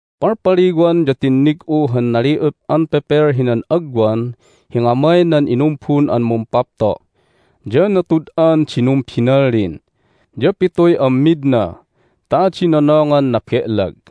Palpaliwan ya tinnig'u han nali'up an pepel hinan agwan hi ngamay nan inumbun an Mumpapto'. Ya natud'an di numbinallin, ya pituy ammidna ta adi nonongan nabe'lag.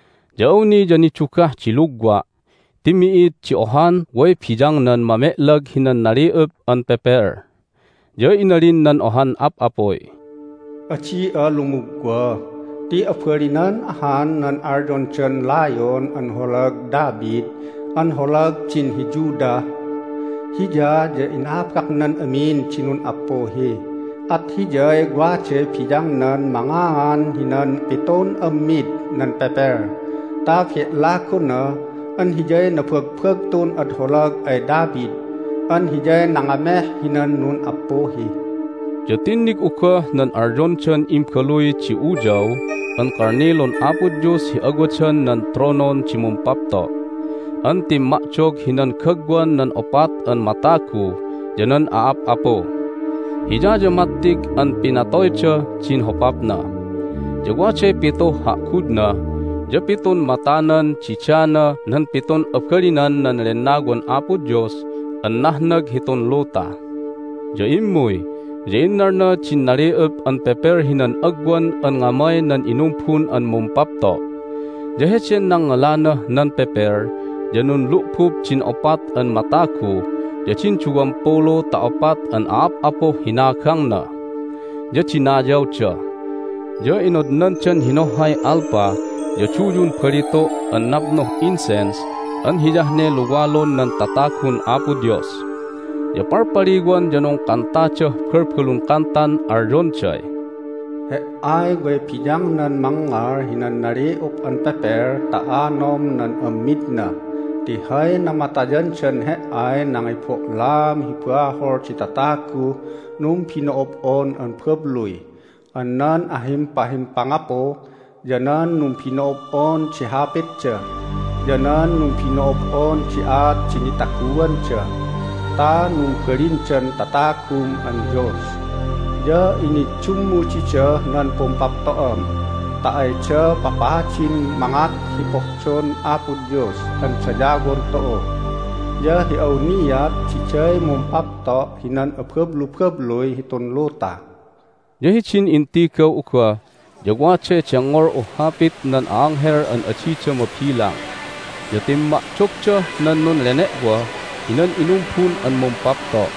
Ya awni ya nidugah di lugwa' ti mi'id di ohan way biyangnan mame'lag hinan nali'up an pepel. Ya inalin nan ohan ap'apuy, "Adi'a lumugwa. Ti abalinan ahan nan alyondan Layon an holag David an holag din hi Judah. Hiya ya inabaknan amin di nun'appuhi, at Hiyay waday biyangnan mangaan hinan pitun ammid nan pepel ta be'lagona an Hiyay nabagbagtun ad holag ay David an Hiyay nangameh hinan nun'appuhi!" Ya tinnig'u goh nan alyondan imbaluy di Uyaw an Kalnilun Apo Dios hi awadan nan tronon di Mumpapto' an timma'dog hinan gagwan nan opat an matagu ya nan a'ap'apu. Hiya ya mattig an pinatoydah din hopapna. Ya waday pituh ha'gudna ya pitun matanan didana nan pitun abalinan nan Lennawan Apo Dios an nahnag hitun luta. Ya immuy, ya innalna din nali'up an pepel hinan agwan an ngamay nan inumbun an Mumpapto'. Ya heden nangngalanah nan pepel ya nunlu'bub din opat an matagu ya din duwampulu ta opat an a'ap'apuh hinagangna, ya dinayawda. Ya inodnandan hinohhay alpa ya duyun balitu' an napnuh incense an hiyah ne luwalun nan tatagun Apo Dios. Ya palpaliwan ya nungkantadah balbalun kantan alyonday, "He"ay way biyangnan mangngal hinan nali'up an pepel ta anom nan ammidna ti hay namatayandan He"ay nangibo'laam hi bahol di tataguh numbino'ob'on an babluy an nan ahimpahimpangapu, ya nan numbino'ob'on di hapitda, ya nan numbino'ob'on di aat di nitaguanda ta numbalindan tatagum an Dios. Ya iniddummu didah nan pumpapto'am ta ayda papadin mangat hi pohdon Apo Dios an dayawon tu'u, ya hi awniat diday mumpapto' hinan abablubabluy hitun luta." Ya hidin intigaw'u goh ya waday dengngol'uh hapit nan a'anghel an adida mabilang. Ya timma'dogdah nan nunlene'woh hinan inumbun an Mumpapto',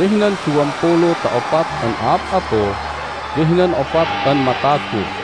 ya hinan duwampulu ta opat an a'ap'apu, ya hinan opat an matagu.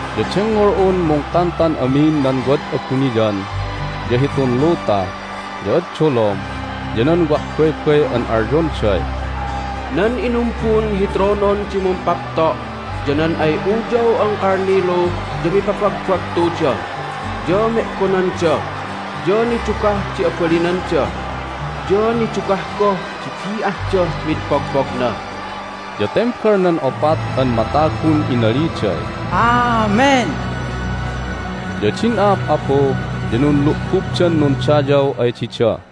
Ya dengngol'un mungkantan amin nan wad abuniyan, ya hitun luta, ya ad dolom, ya nan wah baybay an alyonday, "Nan inumbun hi tronon di Mumpapto' ya nan ay Uyaw an Kalnilu ya mipabagbagtuda, ya me'gonanda, ya nidugah di abalinanda, ya nidugah goh di bi'ahdah mid pogpogna!" Ya tembal nan opat an matagun inaliday, "Amen!" Ya din a'ap'apu ya nunlu'bubdan nundayaw ay dida.